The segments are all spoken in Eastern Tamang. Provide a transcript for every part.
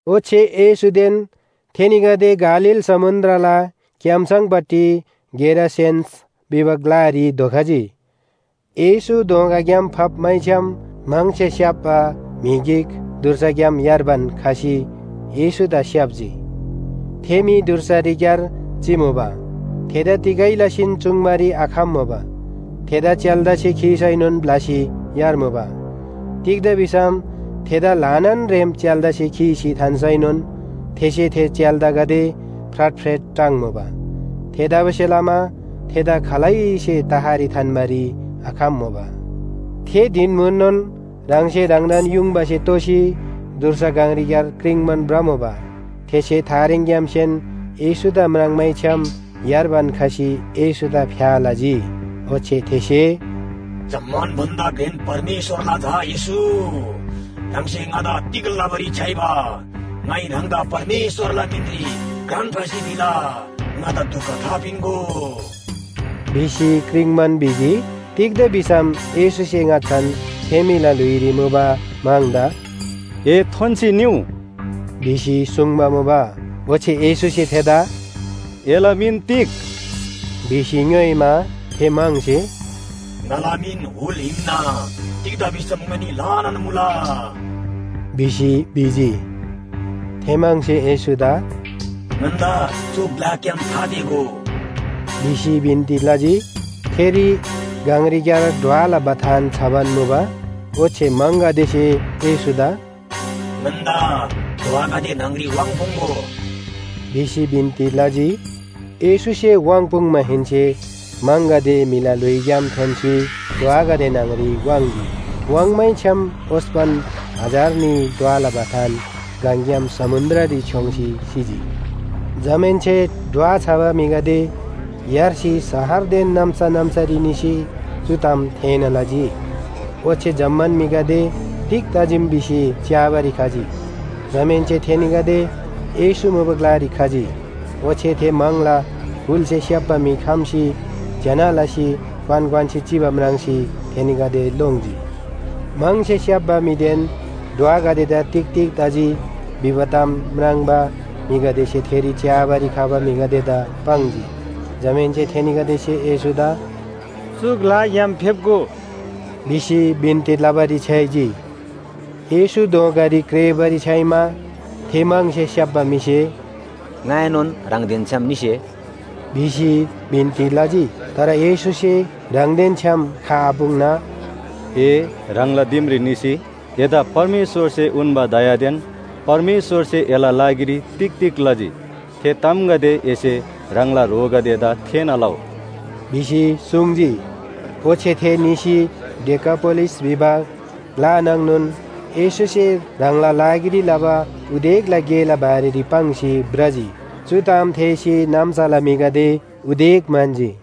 ओच्‍छे येशूदेन थेनीगदे गालील समुन्‍द्रला क्‍याम्‍सङपट्टि गेरासेनस भिबा ग्‍लारी धोखजी। येशू दोँगाग्‍याम फप्‍मैछ्‌याम म्‍हङसे स्‍याप्‍बा म्‍हि गिक धुर्साग्‍याम यार्बान खसी येशूदा स्‍याप्‍जी। थे म्‍हि धुर्सारीक्‍यार चिमुबा। थेदा तिगै लसीन चुङ्बारी आखम्‍मुबा थेदा च्‍याल्‍दासे खीसैनोन ब्‍लसी यार्मुबा। तिग्‍दा भिसम थेदा ल्‍हानान रेम च्‍याल्‍दासे खीसी थान्‍सैनोन थेसे थे च्‍याल्‍दागदे फ्राटफ्रेट टाङ्मुबा। थेतबासेलमा थेदा खालैसे तहरी थान्‍बारी आखम्‍मुबा। थे धिन म्‍हुननोन ह्राङसे ह्राङदान युङबासे तोसी धुर्सा गङरीक्‍यार क्रिङ्बान भ्रमुबा। थेसे थारेङग्‍यामसेन येशूदा म्राङ्मैछ्‍याम यार्बान खसी येशूदा फ्‍या लजी। ओच्‍छे थेसे “जम्‍मान भन्‍दा घ्रेन परमेश्‍वरला झा येशू, ह्राङसे ङादा तिग लबारी छ्‌याइबा? ङाइ ह्राङदा परमेश्‍वरला मिनरी घ्रान फासी भिला, ङादा दुख थापिन्‍गो” भिसी क्रिङ्बान भिजी। तिग्‍दा भिसम येशूसे ङाच्‍छान थे म्‍हिला ल्‍हुइरी मुबा म्‍हङदा “ए थोन्‍सी निउ” भिसी सुङ्बा मुबा। ओच्‍छे येशूसे थेदा “एला मिन तिग?” भिसी ङ्‌योइमा, थे म्‍हङसे “ङाला मिन हुल हिन्‍ना, तिग्‍दा भिसम ङनी ल्‍हानान मुला” भिसी भिजी। थे म्‍हङसे येशूदा “ङन्‍दा चु ग्‍लाग्‍याम थातेःगो।” भिसी बिन्‍ती लजी। थेरी गङरीक्‍यार ढ्वला बथान छबान मुबा। ओच्‍छे म्‍हङगदेसे येशूदा “ङन्‍दा ढ्वागदे न्‍हङरी वाङ्पुङ्‍गो” भिसी बिन्‍ती लजी येशूसे वाङ्‌पुङ्‌माहेन्‍से म्‍हङगदे म्‍हिला ल्‍हुइग्‍याम थोन्‍सी ढ्वागदे न्‍हङरी वाङ्‌जी। वाङ्मैछ्‌याम ओस्‍पन, हजार न्‍ही ढ्वला बथान गङग्‍याम समुन्‍द्ररी छ्‌योङ्सी सिजी। जमाहेन्‍से ढ्वा छबा म्‍हिगदे यार्सी शहरदेन नाम्‍सा नाम्‍सारी निसी चु ताम थेःना लजी। ओच्‍छे जम्‍मान म्‍हिगदे तिग तजीम भिसी च्‍याबारी खजी। जमाहेन्‍से थेनीगदे येशू मुबा ग्‍लारी खजी, ओच्‍छे थे म्‍हङला हुलसे स्‍याप्‍बा म्‍हि खम्‍सी ज्‍यना लसी क्‍वान क्‍वान्‍सी चिबा म्राङ्सी थेनीगदे लोङ्जी। म्‍हङसे स्‍याप्‍बा म्‍हिदेन ढ्वागदेदा तिग तिग तजी भिबा ताम म्राङ्बा म्‍हिगदेसे थेरी च्‍याबारी खबा म्‍हिगदेदा पाङ्जी। जमाहेन्‍से थेनीगदेसे येशूदा “चु ग्‍लाग्‍याम फेप्‍गो” भिसी बिन्‍ती लबारी छ्‌याइजी। येशू दोँगारी क्रेःबारी छ्‌याइमा थे म्‍हङसे स्‍याप्‍बा म्‍हिसे “ङाएनोन ह्राङदेन छ्‌याम निसे” भिसी बिन्‍ती लजी। तर येशूसे ह्राङदेन छ्‌याम खआपुङ्ना “ए ह्राङला दिमरी निसी एदा परमेश्‍वरसे उन्‍बा दयादेन परमेश्‍वरसे एला लागिरी तिग तिग लजी, थे तामगदे एसे ह्राङला ह्रोगदेदा थेःना लउ” भिसी सुङ्जी। ओच्‍छे थे निसी डेकापोलिस भिबा ग्‍ला नाङनोन येशूसे ह्राङला लागिरी लबा उदेकला गेला बारेरी पाङ्सी भ्रजी, चु ताम थेःसी नाम्‍साला म्‍हिगदे उदेक म्‍हन्‍जी।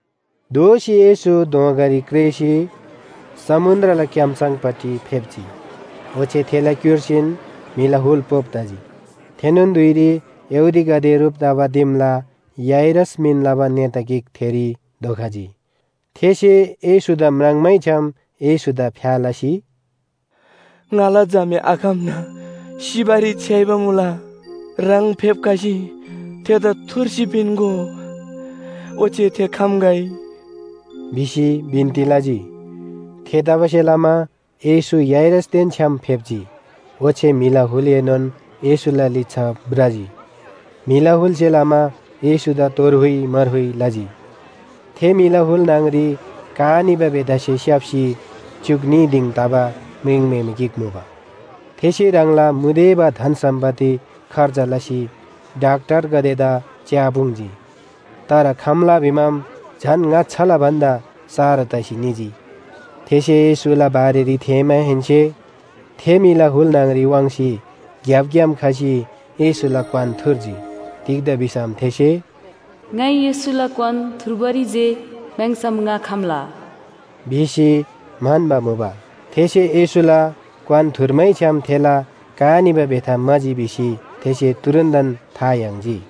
दोःसी येशू दोँगारी क्रेःसी समुन्‍द्रला क्‍याम्‍सङपट्टि फेप्‍जी। ओच्‍छे थेला क्‍युर्सीन म्‍हिला हुल पोप तजी। थेनोन धुइरी यहूदीगदे ह्रुप तबा दिमला याइरस मिन लबा नेता गिक थेरी धोखजी। थेसे येशूदा म्राङ्मैछ्‍याम येशूदा फ्‍या लसी, “ङाला झामे आखम्‍ना सिबारी छ्‌याइबा मुला, ह्राङ फेप्‍खसी थेदा थुर्सी पिन्‍गो। ओच्‍छे थे खम्‍गै” भिसी बिन्‍ती लजी। थेतबासेलमा येशू याइरसदेन छ्‌याम फेप्‍जी ओच्‍छे म्‍हिला हुलएनोन येशूला लिच्‍छा भ्रजी, म्‍हिला हुलसे लमा येशूदा तोर हुइ मार हुइ लजी। थे म्‍हिला हुल न्‍हङरी का निबा बेथासे स्‍याप्‍सी च्‍युक न्‍ही दिङ तबा म्रिङम्‍हेमे गिक मुबा। थेसे ह्राङला मुदेबा धन सम्‍पत्ति खर्च लसी डाक्‍टरगदेदा च्‍यापुङ्जी। तर खम्‍ला भिमाम झन ङाच्‍छाला भन्‍दा सारो तसी निजी। थेसे येशूला बारेरी थेःमाहेन्‍से थे म्‍हिला हुल न्‍हङरी वाङ्सी ग्‍यापग्‍याम खसी येशूला क्‍वान थुर्जी। तिग्‍दा भिसम थेसे “ङाइ येशूला क्‍वान थुर्बारी जे म्‍याङ्‍सम ङा खम्‍ला” भिसी म्‍हन्‍बा मुबा। थेसे येशूला क्‍वान थुर्मैछ्‌याम थेला का निबा बेथा म्‍हाजी भिसी थेसे तुरुन्‍तन था याङ्जी।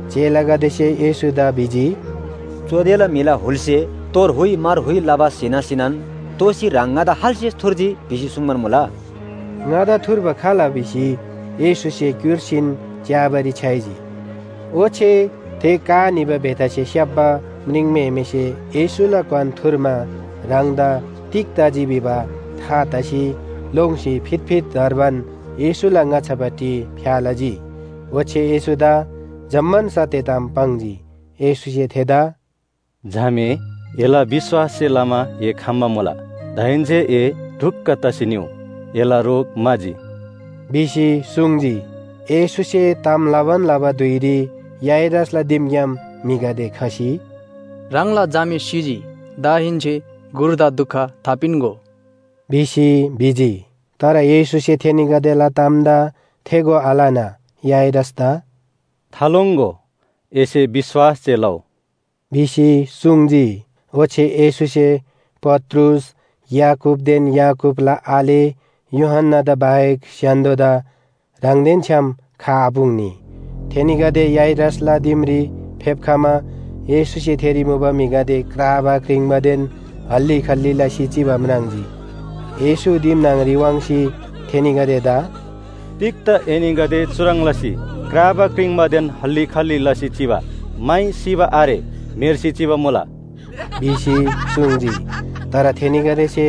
चेलागदेसे येशूदा भिजी, “चुदेला म्‍हिला हुलसे तोर हुइ मार हुइ लबा स्‍हीना स्‍हीनान दोःसी ह्राङ ‘ङादा खाल्‍से थुर्जी’ भिसी सुङ्बान मुला।” ङादा थुर्बा खाल भिसी येशूसे क्‍युर्सीन च्‍याबारी छ्‌याइजी। ओच्‍छे थे का निबा बेथासे स्‍याप्‍बा म्रिङम्‍हेमेसे येशूला क्‍वान थुर्मा ह्राङदा तिग तजी भिबा था तसी लोङ्सी फितफित धर्बान येशूला ङाच्‍छापट्टि फ्‍या लजी। ओच्‍छे येशूदा जम्‍मान सत्‍य ताम पाङ्जी। येशूसे थेदा “झामे, एला विश्‍वाससे लमा ए खम्‍बा मुला। दाहेन्‍से ए ढुक्‍क तसी निउ, एला रोग म्‍हाजी” भिसी सुङ्जी। येशूसे ताम लबान लबा धुइरी याइरसला दिमग्‍याम म्‍हिगदे खसी, “ह्राङला झामे सिजी, दाहेन्‍से गुरुदा दुख थापिन्‍गो” भिसी भिजी। तर येशूसे थेनीगदेला तामदा थेगो आलना, याइरसदा “थालोङ्‍गो, एसे विश्‍वास जे लउ” भिसी सुङ्जी। ओच्‍छे येशूसे पत्रुस, याकूबदेन याकूबला आले यूहन्‍नादा बाहेक स्‍य्‍हान्‍दोदा ह्राङदेन छ्‌याम खआपुङ्नी। थेनीगदे याइरसला दिमरी फेप्‍खमा येशूसे थेरी मुबा म्‍हिगदे क्राबा क्रिङ्बादेन हल्‍ली खल्‍ली लसी चिबा म्राङ्जी। येशू दिम न्‍हङरी वाङ्सी, थेनीगदेदा “तिग्‍दा एनीगदे चुह्रङ् लसी क्राबा क्रिङ्बादेन हल्‍ली खल्‍ली लसी चिबा? माइ सिबा आरे, म्‍हेर्सी चिबा मुला” भिसी सुङ्जी। तर थेनीगदेसे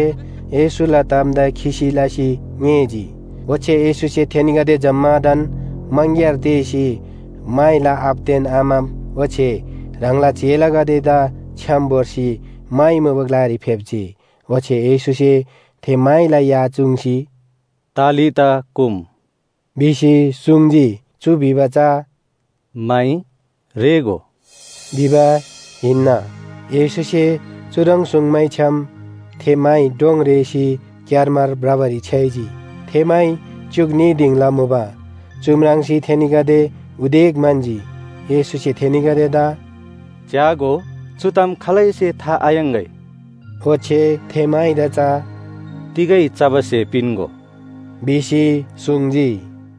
येशूला तामदा खिसी लसी ङेःजी। ओच्‍छे येशूसे थेनीगदे जम्‍मादान मङग्‍यार तेःसी माइला आबादेन आमा ओच्‍छे ह्राङला चेलागदेदा छ्‌याम भोर्सी माइ मुबा ग्‍लारी फेप्‍जी। ओच्‍छे येशूसे थे माइला या चुङ्सी, “तालिता कुम,” भिसी सुङ्जी। चु भिबा चा “माइ रेःगो” भिबा हिन्‍ना। येशूसे चुह्रङ् सुङ्मैछ्‌याम थे माइ डोङ रेःसी क्‍यारमार भ्रबारी छ्‌याइजी। थे माइ च्‍युक न्‍ही दिङला मुबा। चु म्राङ्सी थेनीगदे उदेक म्‍हन्‍जी। येशूसे थेनीगदेदा “च्‍यागो, चु ताम खालैसे था थायाङ्‍गै।” ओच्‍छे थे माइदा चा “तिगै चबा स्‍हे पिन्‍गो” भिसी सुङ्जी।